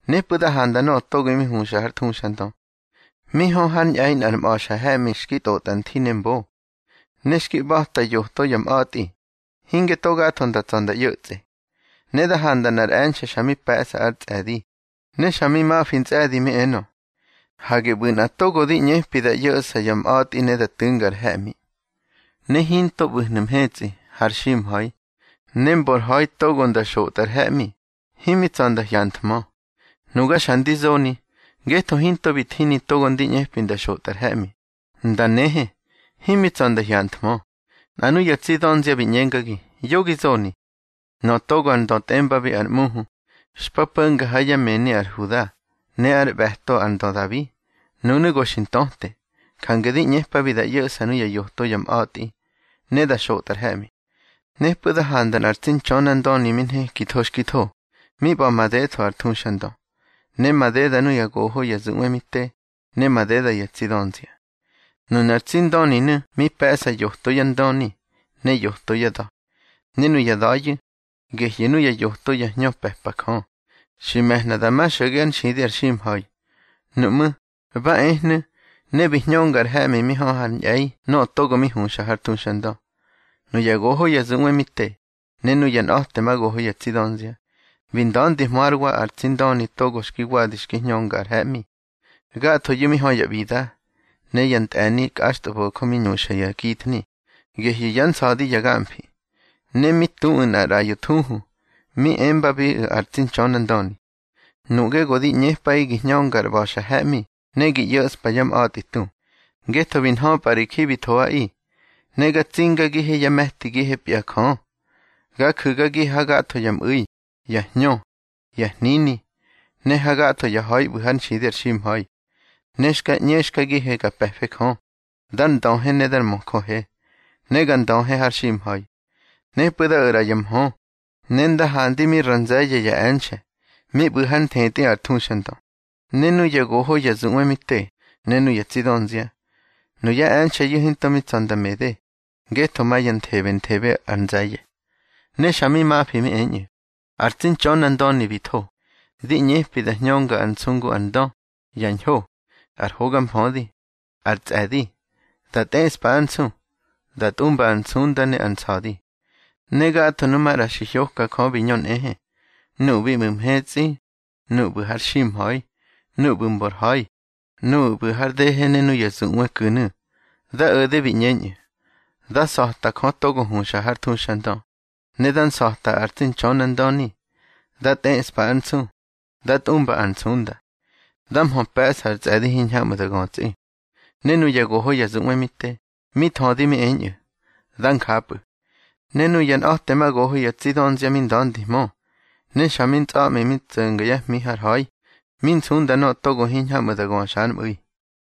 Nepꞌu̱ da handa nöꞌö togo mi huxa har thuxandö, mi hö hár ñꞌe̱i nꞌar mꞌa̱xa he̱ꞌmi xki tꞌotꞌa nthi ne mbo, ne xki ꞌba̱ta yoto ya mꞌa̱tꞌi, hinge to gatho nda tsa̱ nda ꞌyo̱tsꞌe. Ne da handa nꞌar e̱nxe̱ xa mi pe̱ꞌsa ár tsꞌe̱di, ne xa mi mafi ntsꞌe̱di mi enö: —Hage ꞌbu̱ nꞌa togo di ꞌñepi da ꞌyo̱ꞌsa ya mꞌa̱tꞌi ne da tu̱nga ar he̱ꞌmi. Ne hinto mi ꞌbu̱hnu̱ mhetsꞌi, har ximha̱i, ne mbor ha̱i togo nda xotꞌa ar he̱ꞌmi, himi tsa̱ nda hyanthmö. Nuga xa ndi zoni, ngetho hinto bi thini togo ndi ꞌñepi nda xotꞌa ar he̱ꞌmi, nda nehe, himi tsa̱ nda hyanthmö. Nꞌa nuya tsi dönzia bi ꞌñengagi: —Yo gi zoni. Nöꞌö togo ar Ndö tꞌembabi ar ꞌMuhu, xpa po̱nga ha yá mëni ar Huda ne ár ꞌbe̱to ar ndö Dabi, nunu̱ go xi ntöte. Jange di ꞌñepabi da ꞌyo̱ꞌsa nuya yoto ya mꞌa̱tꞌi, ne da xotꞌa ar he̱ꞌmi. Nepꞌu̱ da handa nꞌar tsi Ntxönandöni mi nhekitho xki tho, mi ꞌba̱ madetho ar thuxandö, ne madeda nuya goho ya zuꞌwe mi te, ne madeda ya tsi dönzia. Nunar tsi Ndöninu̱ mi pe̱ꞌsa yoto yá ndöni, ne yoto yá da̱. Ne nuya da̱yu̱, gehyu̱ nuya yoto ya hñö pe̱pa Jö, xi me̱hna da ma xo̱ge ár nxidi ar ximha̱i. Nuꞌmú̱, ba ehnu̱, ne bi hñönga ar he̱ꞌmi mi hö hár ñꞌe̱i nöꞌö togo mi huxa har thuxandö. Nuya goho ya zuꞌwe mi te, ne nuya nꞌa̱temagoho ya tsi dönzia, bi nda̱ndihmö hár wa ar tsi Ndöni togo xki wadi xki hñönga ar he̱ꞌmi. Gathoyu̱ mi hö ya ꞌbida, ne ya ntꞌe̱ni kꞌaxtꞌabo̱jö mi ñuxa ya githni, gehyu̱ yá nsa̱di ya gamfi. Ne mi tuꞌu̱ nꞌar ꞌraꞌyo thuhu, mi embabiꞌu̱ ar tsi Ntxönandöni: Nuꞌge go di ꞌñepꞌaꞌi gi hñönga ar ꞌba̱xa he̱ꞌmi ne gi ꞌyo̱ꞌspa yá mꞌa̱tꞌi tu, ngetho bi nhöpꞌa ri ji bi thoꞌaꞌi, ne ga tsingagihe yá me̱tigihepya Jö. Ga ju̱gagihe hagatho ya mꞌu̱i, ya hñö, ya hnini, ne hagatho ya ha̱i ꞌbu̱ hár nxidi ar ximha̱i. Ne xka ꞌñexkagihe ga pe̱fe Jö, dar ndöhe ne dar möjöhe, ne ga ndöhe har ximha̱i. Nepꞌu̱ da o̱ ꞌra ya mhö, ne nda handi mi ra nze̱ye̱ ya e̱nxe̱, mi ꞌbu̱ hár nthetꞌi ar thuxandö, ne nuya goho ya zuꞌwe mi te, ne nuya tsi dönzia. Nuya e̱nxe̱yu̱ hinto mi tsa̱ nda mede, ngetho ma ya nthebenthebe ár nze̱ye̱. Ne xa mi mafi mi eñꞌu̱: Ar tsi Ntxönandöni bi tho, di ꞌñepabi da hñönga ar nsu ngu ar ndö, ya ñho, ar hoga mfödi, ar tsꞌe̱di, da tꞌeꞌspa ár nsu, da tꞌumba ar nsunda ne ar nsa̱di. Ne gatho nu maꞌra xi hyoka Jö bi ñö nꞌehe, nuꞌu̱ bi ꞌbu̱ mhetsꞌi, nuꞌu̱ ꞌbu̱ har ximha̱i, nuꞌu̱ ꞌbu̱ mbor ha̱i, nuꞌu̱ ꞌbu̱ har dehe ne nuꞌu̱ ya zuꞌwe ku̱nu̱. Da o̱de bi ꞌñeñꞌu̱: Dá nsa̱ta Jö togo huxa har thuxandö, ne dá nsa̱ta ar tsi Ntxönandöni. Dá tꞌeꞌspa ár nsu, dá tꞌumba ar nsunda. Dá mhö pe̱ꞌsa ar tsꞌe̱di hiñhamꞌu̱ da götsꞌi. Ne nuya goho ya zuꞌwe mi te, mi thödi mi eñꞌu̱: —Dá njapꞌu̱. Ne nuya nꞌa̱temagoho ya tsi dönzia mi nda̱ndihmö, ne xa mi ntsꞌa̱ꞌmi mi tso̱nga yá hmi har ha̱i, mi nsunda nöꞌö togo hiñhamꞌu̱ da göxa ár mꞌu̱i.